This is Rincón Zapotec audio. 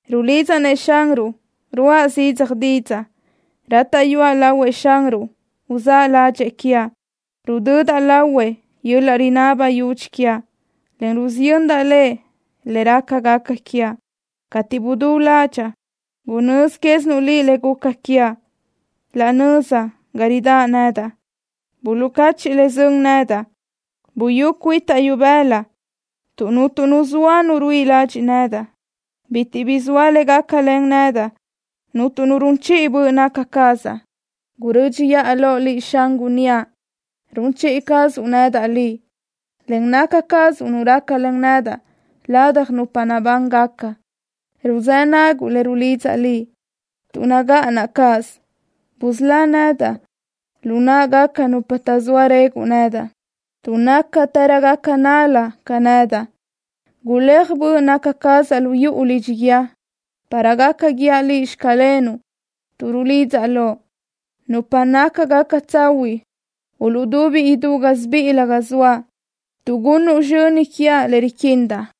Rulidzaʼ-nëʼ Xanruʼ, ruʼa zidzaj didzaʼ. Rátaʼyuaʼ lahuëʼ Xanruʼ uzáʼ ládxëʼë quiaʼ. Rudödaʼ lahuëʼ yöl-laʼ rinaba yudxi quiaʼ, en rusiyöndaʼ Lëʼ le rácagaca quiaʼ. Cateʼ budú ládxaʼa, gunözi quézinuʼ Liʼ le guca quiaʼ. Laʼ nöza ga ridáʼ nedaʼ buluʼcachiʼ le sön nedaʼ. Buyú cuitaʼ ibëla tuʼ cuntu nu zoa nu ruíʼi ladxiʼ nedaʼ. Bitiʼ bi zoa le gácalen nedaʼ. Cuntu nu run chiʼi böʼ naca cazaʼ. Gurö́dxiʼa loʼ Liʼ, Xan, gunníaʼ: Run chiʼi cazuʼ nedaʼ Liʼ, en naca cazuʼ Nu rácalen nedaʼ ladaj nupa nabángaca. Ruzë́ naguʼ le rulidzaʼ Liʼ, tuʼ nagáʼanaʼ cáʼasö. Busölá nedaʼ lu náʼagaca nupa taʼzóa reguʼ nedaʼ, tuʼ nácatërögaca nál-la ca nedaʼ. Guléaj böʼ naca cazaʼ lu yuʼu lidxi guíë, para gaca guíaʼ Liʼ: “Xclenuʼ” tuʼ rulidzaʼ Loʼ. Nupa nácagaca tsahuiʼ uluʼdubi idú gásibiʼilö ga zoaʼ, tuʼ gunnuʼ sizxöni quiaʼ le riquindaʼ.